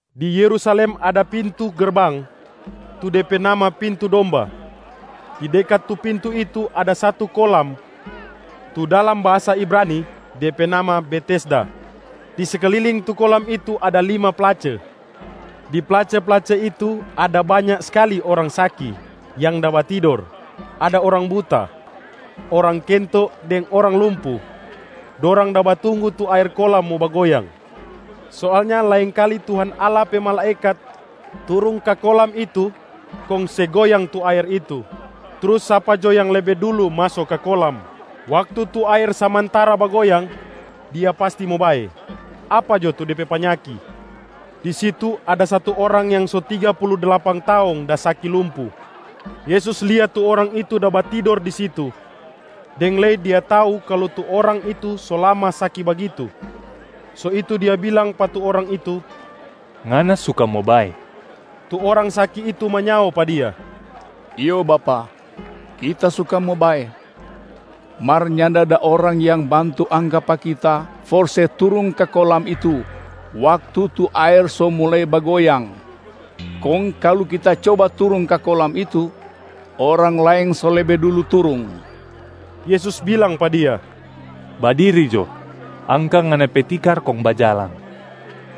Di Yerusalem ada pintu gerbang, tu de pe nama ‘Pintu Domba’. Di dekat tu pintu itu ada satu kolam tu dalam bahasa Ibrani de pe nama Betesda. Di sekliling tu kolam itu ada lima place. Di place-place itu ada banya skali orang saki yang da batidor: ada orang buta, orang kento deng orang lumpu. [Dorang da batunggu tu aer kolam mo bagoyang. Soalnya laengkali Tuhan Allah pe malaekat turung ka kolam itu kong se goyang tu aer itu. Trus sapa jo yang lebe dulu maso ka kolam waktu tu aer samantara bagoyang, dia pasti mo bae, apa jo tu de pe panyaki.] Di situ, ada satu orang yang so tiga pulu dlapan taong da saki lumpu. Yesus lia tu orang itu da batidor di situ, deng lei Dia tau kalu tu orang itu so lama saki bagitu. So itu Dia bilang pa tu orang itu, “Ngana suka mo bae?” Tu orang saki itu manyao pa Dia, “Iyo Bapak, kita suka mo bae, mar nyanda ada orang yang bantu angka pa kita for se turung ka kolam itu waktu tu aer so mulai bagoyang. Kong kalu kita coba turung ka kolam itu, orang laeng so lebe dulu turung.” Yesus bilang pa dia, “Badiri jo, angka ngana pe tikar kong bajalang.”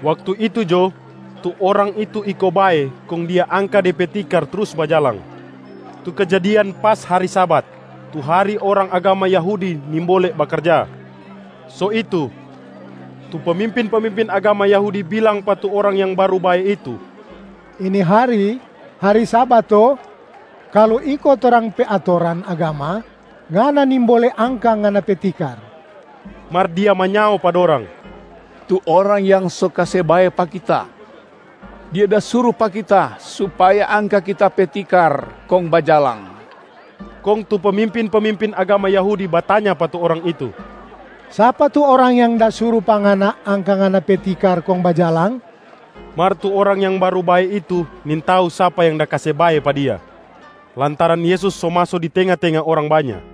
Waktu itu jo, tu orang itu iko bae kong dia angka de pe tikar trus bajalang. Tu kejadian pas hari Sabat, tu hari orang agama Yahudi nimbole bakarja. So itu, tu pemimpin-pemimpin agama Yahudi bilang pa tu orang yang baru bae itu, “Ini hari, hari Sabat to? Kalu iko torang pe atoran agama, ngana nimbole angka ngana pe tikar.” Mar dia manyao pa dorang, “Tu Orang yang so kase bae pa kita, Dia da suru pa kita supaya angka kita pe tikar kong bajalang.” Kong tu pemimpin-pemimpin agama Yahudi batanya pa tu orang itu, “Sapa tu Orang yang da suru pa ngana angka ngana pe tikar kong bajalang?” Mar tu orang yang baru bae itu nintau sapa yang da kase bae pa dia, lantaran Yesus so maso di tenga-tenga orang banya.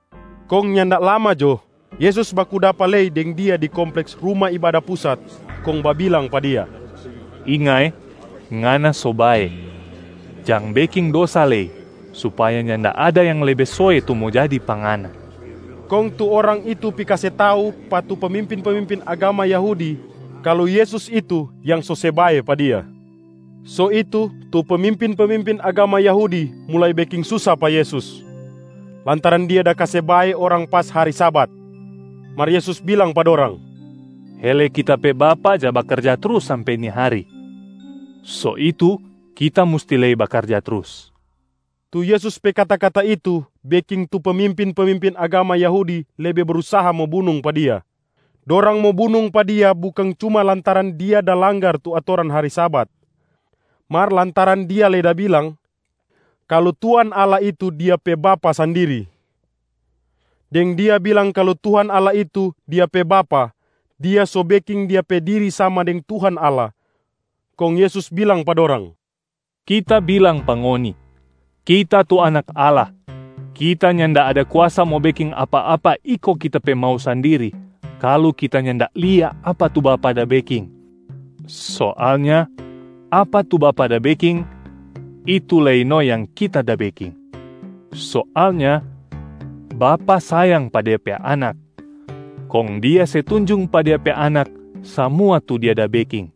Kong nyanda lama jo, Yesus baku dapa lei deng dia di kompleks Ruma Ibada Pusat kong babilang pa dia, “Inga eh, ngana so bae. Jang beking dosa lei supaya nyanda ada yang lebe soe tu mo jadi pa ngana.” Kong tu orang itu pi kase tau pa tu pemimpin-pemimpin agama Yahudi kalu Yesus itu yang so se bae pa dia. So itu tu pemimpin-pemimpin agama Yahudi mulai beking susa pa Yesus lantaran Dia da kase bae orang pas hari Sabat. Mar Yesus bilang pa dorang, “Hele Kita pe Bapa ja bakarja trus sampe ni hari, so itu Kita musti lei bakarja trus.” Tu Yesus pe kata-kata itu beking tu pemimpin-pemimpin agama Yahudi lebe brusaha mo bunung pa Dia. Dorang mo bunung pa Dia bukang cuma lantaran Dia da langgar tu atoran hari Sabat, mar lantaran Dia lei da bilang kalu Tuhan Allah itu Dia pe Bapa sandiri. Deng Dia bilang kalu Tuhan Allah itu Dia pe Bapa, Dia so beking Dia pe diri sama deng Tuhan Allah. Kong Yesus bilang pa dorang, “Kita bilang pa ngoni: Kita tu Anak Allah, Kita nyanda ada kuasa mo beking apa-apa iko Kita pe mau sandiri kalu Kita nyanda lia apa tu Bapa da beking. Soalnya apa tu Bapa da beking, itu lei no yang Kita da beking. Soalnya Bapa sayang pa Dia pe Anak kong Dia se tunjung pa Dia pe Anak samua tu Dia da beking.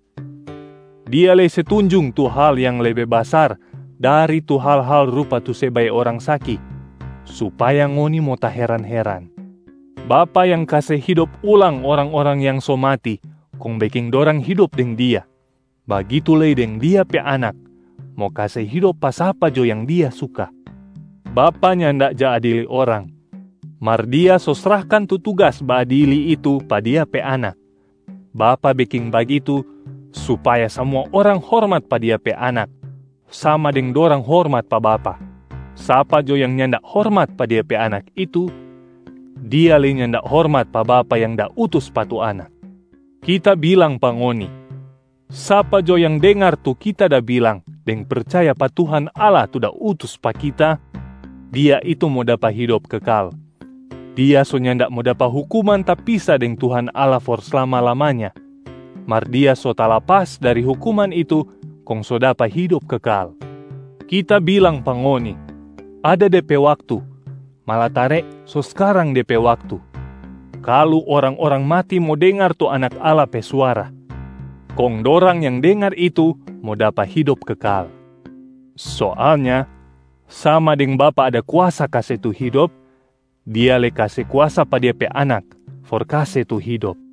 Dia lei se tunjung tu hal yang lebe basar dari tu hal-hal rupa tu se bae orang saki supaya ngoni mo taheran-heran. Bapa yang kase hidop ulang orang-orang yang so mati kong beking dorang hidop deng Dia. Bagitu lei deng Dia pe Anak mo kase hidop pa sapa jo yang Dia suka. Bapa nyanda ja adili orang, mar Dia so srahkan tu tugas baadili itu pa Dia pe Anak. Bapa beking bagitu supaya samua orang hormat pa Dia pe Anak sama deng dorang hormat pa Bapa. Sapa jo yang nyanda hormat pa Dia pe Anak itu, dia lei nyanda hormat pa Bapa yang da utus pa tu Anak. Kita bilang pa ngoni, sapa jo yang dengar tu Kita da bilang deng percaya pa Tuhan Allah tu da utus pa Kita, dia itu mo dapa hidop kekal. Dia so nyanda mo dapa hukuman tapisa deng Tuhan Allah for slama-lamanya, mar dia so talapas dari hukuman itu kong so dapa hidop kekal. Kita bilang pa ngoni, ada de pe waktu malatare so skarang de pe waktu, kalu orang-orang matia mo dengar tu Anak Allah pe suara, kong dorang yang dengar itu mo dapa hidop kekal. Soalnya sama deng Bapa ada kuasa kase tu hidop, Dia lei kase kuasa pa Dia pe Anak for kase tu hidop.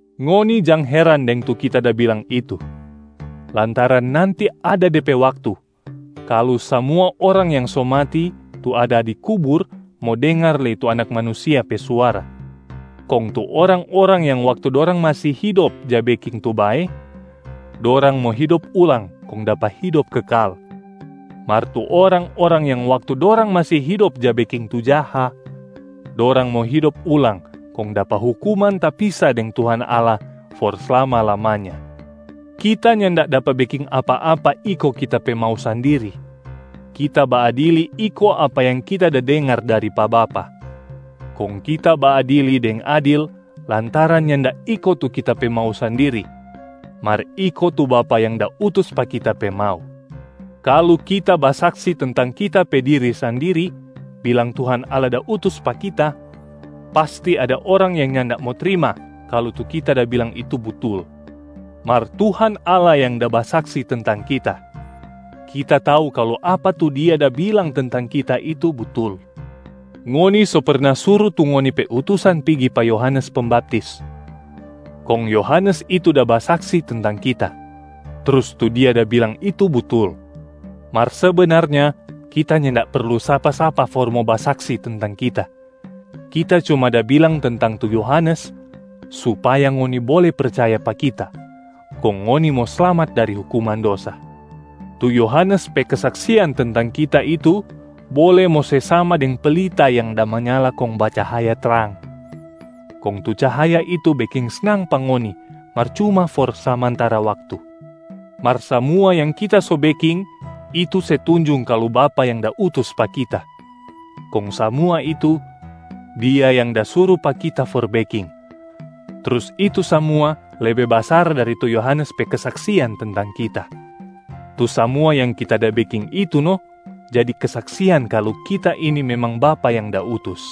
Ngoni jang heran deng tu Kita da bilang itu, lantaran nanti ada de pe waktu kalu samua orang yang so mati tu ada di kubur mo dengar lei tu Anak Manusia pe suara, kong tu orang-orang yang waktu dorang masi hidop ja beking tu bae, dorang mo hidop ulang kong dapa hidop kekal. Mar tu orang-orang yang waktu dorang masi hidop ja beking tu jaha, dorang mo hidop ulang kong dapa hukuman tapisa deng Tuhan Allah for slama-lamanya.” “Kita nyanda dapa beking apa-apa iko Kita pe mau sandiri. Kita baadili iko apa yang Kita da dengar dari pa Bapa. Kong Kita baadili deng adil lantaran nyanda iko tu Kita pe mau sandiri mar iko tu Bapa yang da utus pa Kita pe mau. Kalu Kita basaksi tentang Kita pe diri sandiri bilang Tuhan Allah da utus pa Kita, pasti ada orang yang nyanda mo trima kalu tu Kita da bilang itu butul. Mar Tuhan Allah yang da basaksi tentang Kita, Kita tau kalu apa tu Dia da bilang tentang Kita itu butul. Ngoni so perna suru tu ngoni pe utusan pigi pa Yohanes Pembaptis, kong Yohanes itu da basaksi tentang Kita, trus tu dia da bilang itu butul. Mar sebenarnya Kita nyanda perlu sapa-sapa for mo basaksi tentang Kita, Kita cuma da bilang tentang tu Yohanes supaya ngoni bole percaya pa Kita kong ngoni mo slamat dari hukuman dosa. Tu Yohanes pe kesaksian tentang Kita itu bole mo se sama deng pelita yang da manyala kong bacahaya trang. Kong tu cahaya itu beking snang pa ngoni mar cuma for samantara waktu. Mar samua yang Kita so beking itu se tunjung kalu Bapa yang da utus pa Kita. Kong samua itu, Dia yang da suru pa Kita for beking, trus itu samua lebe basar dari tu Yohanes pe kesaksian tentang Kita. Tu samua yang Kita da beking itu no jadi kesaksian kalu Kita ini memang Bapa yang da utus.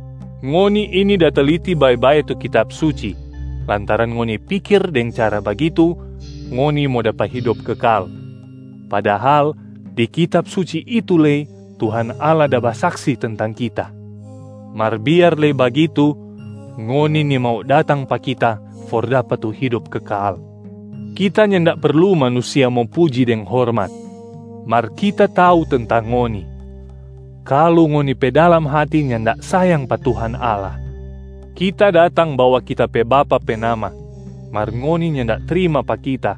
Ngoni ini da teliti bae-bae tu Kitab Suci lantaran ngoni pikir deng cara bagitu ngoni mo dapa hidop kekal. Padahal di Kitab Suci itu lei Tuhan Allah da basaksi tentang Kita. Mar biar lei bagitu, ngoni nimau datang pa Kita for dapa tu hidop kekal. Kita nyanda perlu manusia mo puji deng hormat. Mar Kita tau tentang ngoni, kalu ngoni pe dalam hati nyanda sayang pa Tuhan Allah. Kita datang bawa Kita pe Bapa pe nama mar ngoni nyanda trima pa Kita.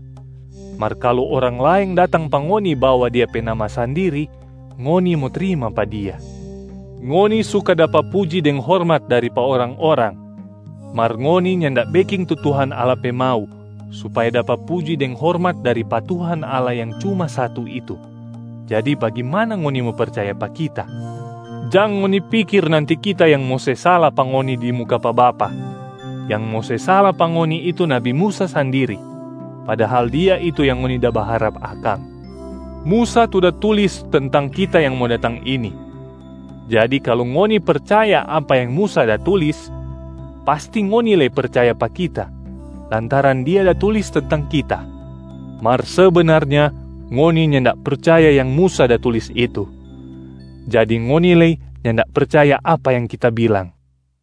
Mar kalu orang laeng datang pa ngoni bawa dia pe nama sandiri, ngoni mo trima pa dia. Ngoni suka dapa puji deng hormat dari pa orang-orang, mar ngoni nyanda beking tu Tuhan Allah pe mau supaya dapa puji deng hormat dari pa Tuhan Allah yang cuma satu itu. Jadi bagimana ngoni mo percaya pa Kita? Jang ngoni pikir nanti Kita yang mo se sala pa ngoni di muka pa Bapa. Yang mo se sala pa ngoni itu nabi Musa sandiri. Padahal dia itu yang ngoni da baharap akang. Musa tu da tulis tentang Kita yang mo datang ini. Jadi kalu ngoni percaya apa yang Musa da tulis, pasti ngoni lei percaya pa Kita, lantaran dia da tulis tentang Kita. Mar sebenarnya ngoni nyanda percaya yang Musa da tulis itu, jadi ngoni lei nyanda percaya apa yang Kita bilang.”